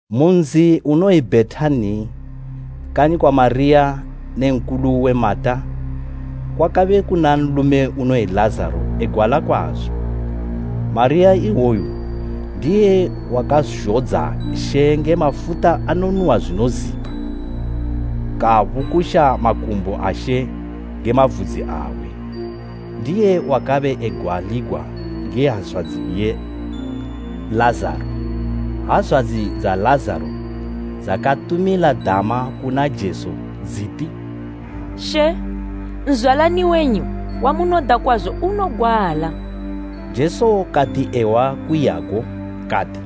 Mu nzi unoyi Bhetani, kanyi kwa Mariya ne nkulu uwe, Mata kwakabe kuna nlume unoyi Lazaro egwala kwazo. Mariya iwoyo ndiye wakazhodza She nge mafuta anonuhwa zwinozipa, kabukusha makumbo a She nge mavudzi awe, ndiye wakabe egwaligwa nge hazwadzi iye Lazaro. Hazwadzi dza Lazaro dzakatumila dama kuna Jesu dziti, “She, nzwalani wenyu wamunoda kwazo unogwala.” Jesu kati ehwa kuiyago, kati,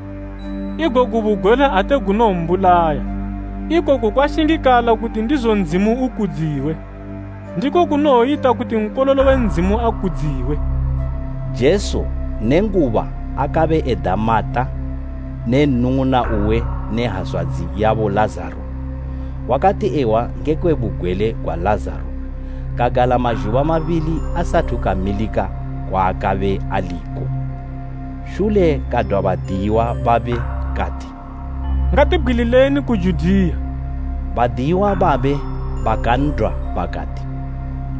“Igogu bugwele ate gunowombulaya, ikoku kwashingikala kuti ndizo Ndzimu ukudziwe, ndiko kunowoyita kuti Nkololo we Ndzimu akudziwe.” Jesu nenguba akabe eda Mata ne nnung'una uwe ne hazwadzi yabo Lazaro, wakati ehwa ngekwe bugwele gwa Lazaro kagala mazhuba mabili asathu kamilika kwaakabe aliko. Shule kadwa badiyiwa babe kati, “Ngatibgwilileni ku Judiya.” Badiyiwa babe bakan'dwa bakati,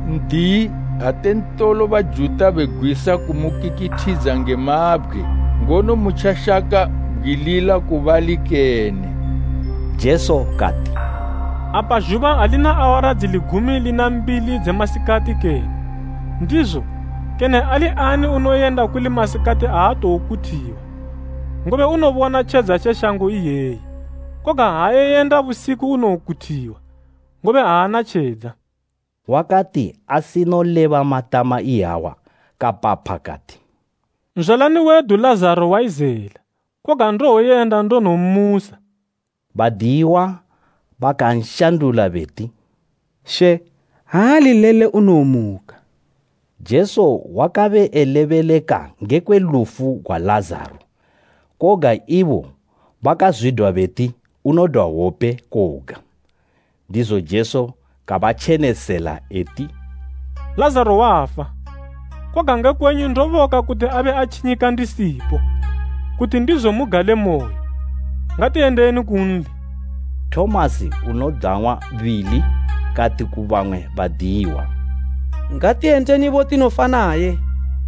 “N'diyi, ate ntolo Bajuta begwisa kumukikithidza nge mabgwe, ngono mutjashaka bgwilila ku bali kene?” Jesu kati, “Apa zhuba alina awara dzili gumi lina mbili dze masikati kene? Ndizo, kene ali ani unoyenda kuli masikati aatokuthiwa, ngobe unobona tjedza tje shango iyeyi. Koga ha iyenda busiku unokuthiwa, ngobe aana tjedza.” Wakati asinoleba matama iyawa kapapha kati, “Nzwalani wedu Lazaro wayizela, koga ndowoyenda ndonommusa.” Badiyiwa bakanshandula beti, “She, ha ali lele unowomuka.” Jesu wakabe elebeleka ngekwe lufu gwa Lazaro, koga ibo bakazwidwa beti unodwa hwope koga. Ndizo Jesu kabatjenesela eti, “Lazaro wafa, koga nge kwenyu ndoboka kuti abe atjinyika ndisipo, kuti ndizo mugalemoyo. Ngatiyendeni kunli.” Tomasi unodang'wa Bili kati ku bamwe badiyiwa, “Ngatiyendenibo tinofa naye!”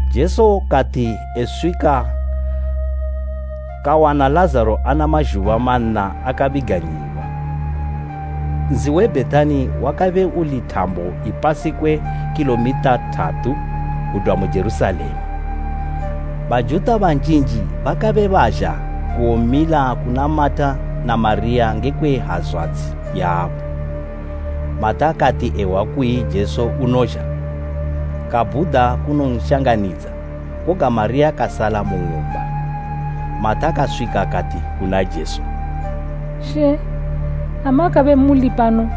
Jesu kati eswika, kawana Lazaro ana mazhuba manna akabiganyiwa. Nzi we Bhetani wakabe uli thambo ipasi kwe khilomitha thatu kudwa mu Jerusalema. Bajuta banjinji bakabe bazha kuwomila kuna Mata na Mariya ngekwe hazwadzi yabo. Mata kati ehwa kuyi Jesu unozha, kabhuda kunonshanganidza, koga Mariya kasala mu ng'umba. Mata kaswika kati kuna Jesu, “She, ha makabe muli pano,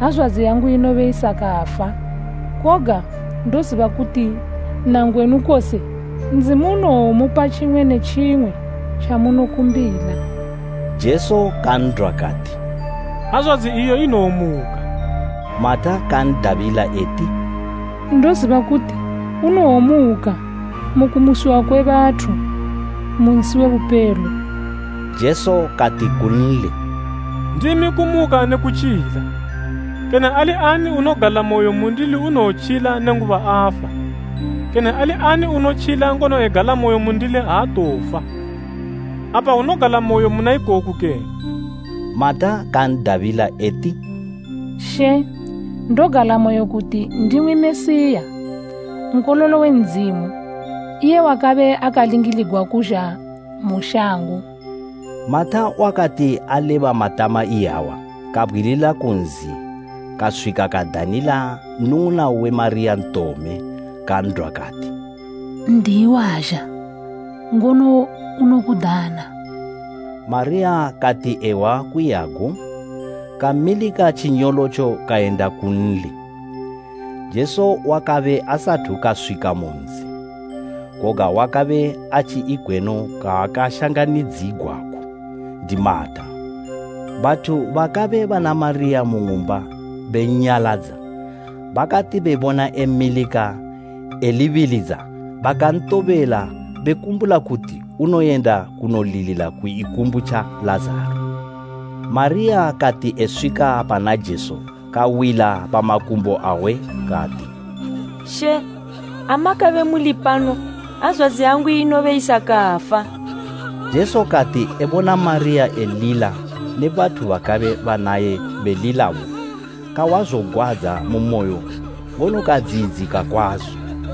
hazwadzi yangu inobe isakafa! Koga ndoziba kuti nangwenu kose Ndzimu unowomupa tjimwe ne tjimwe tjamunokumbila.” Jesu kan'dwa kati, “Hazwadzi iyo inowomuka.” Mata kan'dabila eti, “Ndoziba kuti unowomuka mu kumusiwa kwe bathu mu nsi we bupelo.” Jesu kati kunli, “Ndimi kumuka ne kutjila. Kene ali ani unogalamoyo mundili unowotjila nenguba afa, kene ali ani unotjila ngono egalamoyo mundili aatowofa. Apa unogalamoyo muna ikoku kene?” Mata kan'dabila eti, “She, ndogalamoyo kuti ndimwi Mesiya, Nkololo we Ndzimu, iye wakabe akalingiligwa kuzha mu shango.” Mata wakati aleba matama iyawa, kabgwilila ku nzi kaswika kadanila nnung'una uwe Mariya ntome, kan'dwa kati, “N'diyi wazha, ngono unokudana.” Mariya kati ehwa kuyiyago, kamilika tjinyolotjo kayenda kunli. Jesu wakabe asathu kaswika mu nzi, koga wakabe atji ikweno kwaakashanganidzigwako ndi Mata. Bathu bakabe bana Mariya mu ng'umba bennyaladza, bakati bebona emilika elibilidza bakantobela bekumbula kuti unoyenda kunolilila ku ikumbu tja Lazaro. Mariya kati eswika pana Jesu kawila pa makumbo awe kati, “She, ha makabe muli pano, hazwadzi yangu inobe isakafa!” Jesu kati ebona Mariya elila ne bathu bakabe banaye belilabo, kahwa zogwadza mu moyo ngono kadziyidzika kwazo.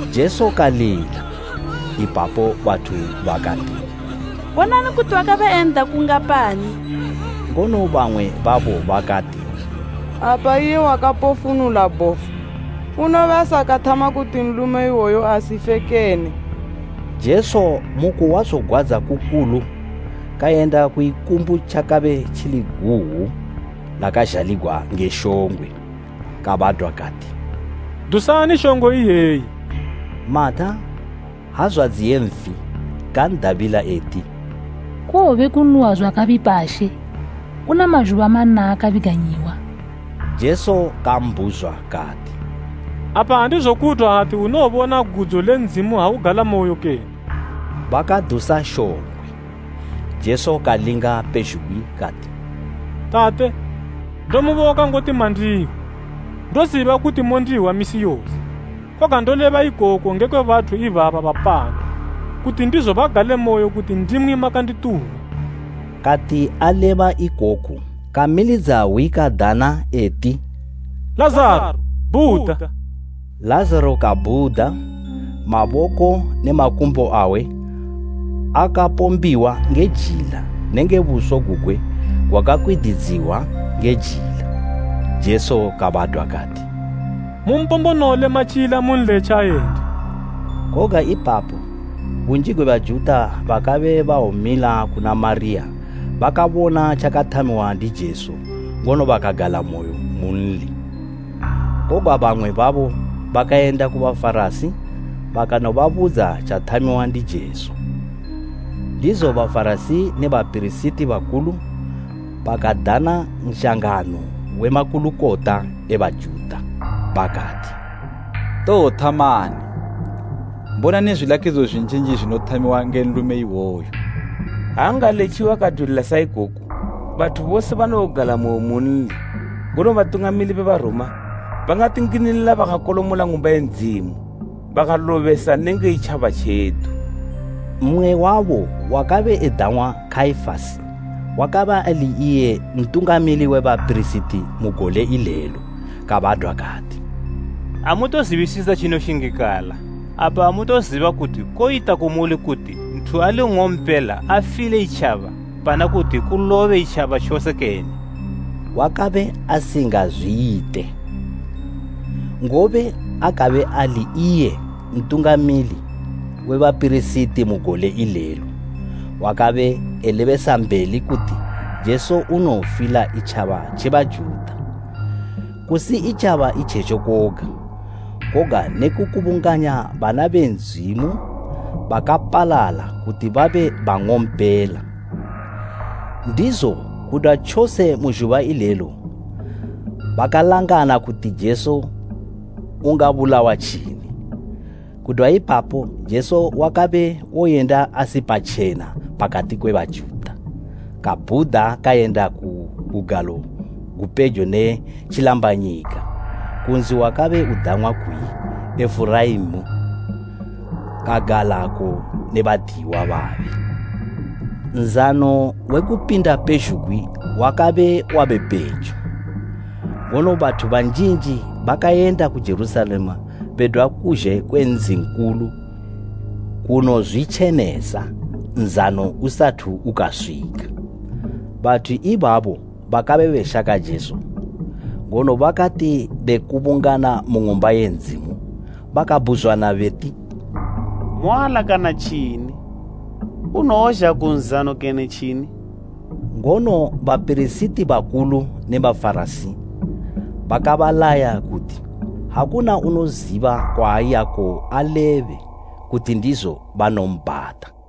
Jesu kalila. Ipapo bathu bakati, “Bonani kuti wakabe en'da kungapani!” Ngono bamwe babo bakati, “Apa iye wakapofunula bhofu, unobe asakathama kuti nlume iwoyu asife kene?” Jesu mu kuhwa zogwadza kukulu kayenda ku ikumbu tjakabe tjili guwu lakazhaligwa nge shongwe. Kabadwa kati, “Dusani shongwe iyeyi.” Mata, hazwadzi ye nfi, kan'dabila eti, “Kowobe konuhwa zwakabipa She. Una mazhuba manna akabiganyiwa!” Jesu kambhuzwa kati, “Apa andizokudwa ati unowobona gudzo le Ndzimu ha ugalamoyo kene?” Bakadusa shongwe. Jesu kalinga pezhugwi kati, “Tate, ndomuboka ngoti mandihwa. Ndoziba kuti mondihwa misi yose, koga ndoleba ikoku ngekwe bathu ibaba bapano, kuti ndizo bagalemoyo kuti ndimwi makandituma.” Kati aleba ikoku, kamilidza hwi kadana eti, “Lazaro, bhuda!” Lazaro kabhuda, maboko ne makumbo awe, akapombiwa nge jila nenge buso gugwe gwakakwididziwa nge jila. Jesu kabadwa kati, “Mumpombonole matyila munletje ayende.” Koga ipapo bunji gwe Bajuta bakabe bawomila kuna Mariya bakabona tjakathamiwa ndi Jesu ngono bakagalamoyo munli. Koga bamwe babo bakayenda ku Bafarasi bakanobabudza tjathamiwa ndi Jesu. Ndizo Bafarasi ne bapirisiti bakulu bakadana nshangano we makulukota e Bajuta, bakati, “Towothamani? Bonani zwilakidzo zwinjinji zwinothamiwa nge nlume iwoyu. Ha angaletjiwa kadwilila sa ikoku, bathu bose banowogalamoyo munli, ngono batungamili be Baroma bangatinginilila bakakolomola Ng'umba ye Ndzimu bakalobesa nenge itjaba tjedu.” Mmwe wabo wakabe edang'wa Kaifasi, wakabe ali iye Ntungamili we bapirisiti mu gole ilelo kabadwa kati, “Amutozibisisa tjinoshingikala. Apa amutoziba kuti koyita kumuli kuti nthu ali nng'ompela afile itjaba pana kuti kulobe itjaba tjose kene?” Wakabe asingazwiyite, ngobe akabe ali iye Ntungamili we bapirisiti mu gole ilelo wakabe elebesambeli kuti Jesu unowofila itjaba tje Bajuta, kusi itjaba itjetjo koga, koga ne kukubunganya bana be Ndzimu bakapalala kuti babe bang'ompela. Ndizo kudwa tjose mu zhuba ilelo bakalangana kuti Jesu ungabulawa tjini. Kudwa ipapo Jesu wakabe woyenda asi patjena pakati kwe Bajuta, kabhuda kayenda ku bugalo gupejo ne tjilambanyika, ku nzi wakabe udang'wa kuyi Ifureimi, kagalako ne badiyiwa babe. Nzano we Kupinda pezhugwi wakabe wabe pejo, ngono bathu banjinji bakayenda ku Jerusalema bedwa kuzhe kwe nzi nkulu kunozwitjenesa, nzano usathu ukaswika. Bathu ibabo bakabe beshaka Jesu, ngono bakati bekubungana mu Ng'umba ye Ndzimu, bakabhuzwana beti, “Moalakana tjini? Unowozha ku nzano kene tjini?” Ngono bapirisiti bakulu ne Bafarasi bakabalaya kuti, ha kuna unoziba kwaayako alebe, kuti ndizo banombhata.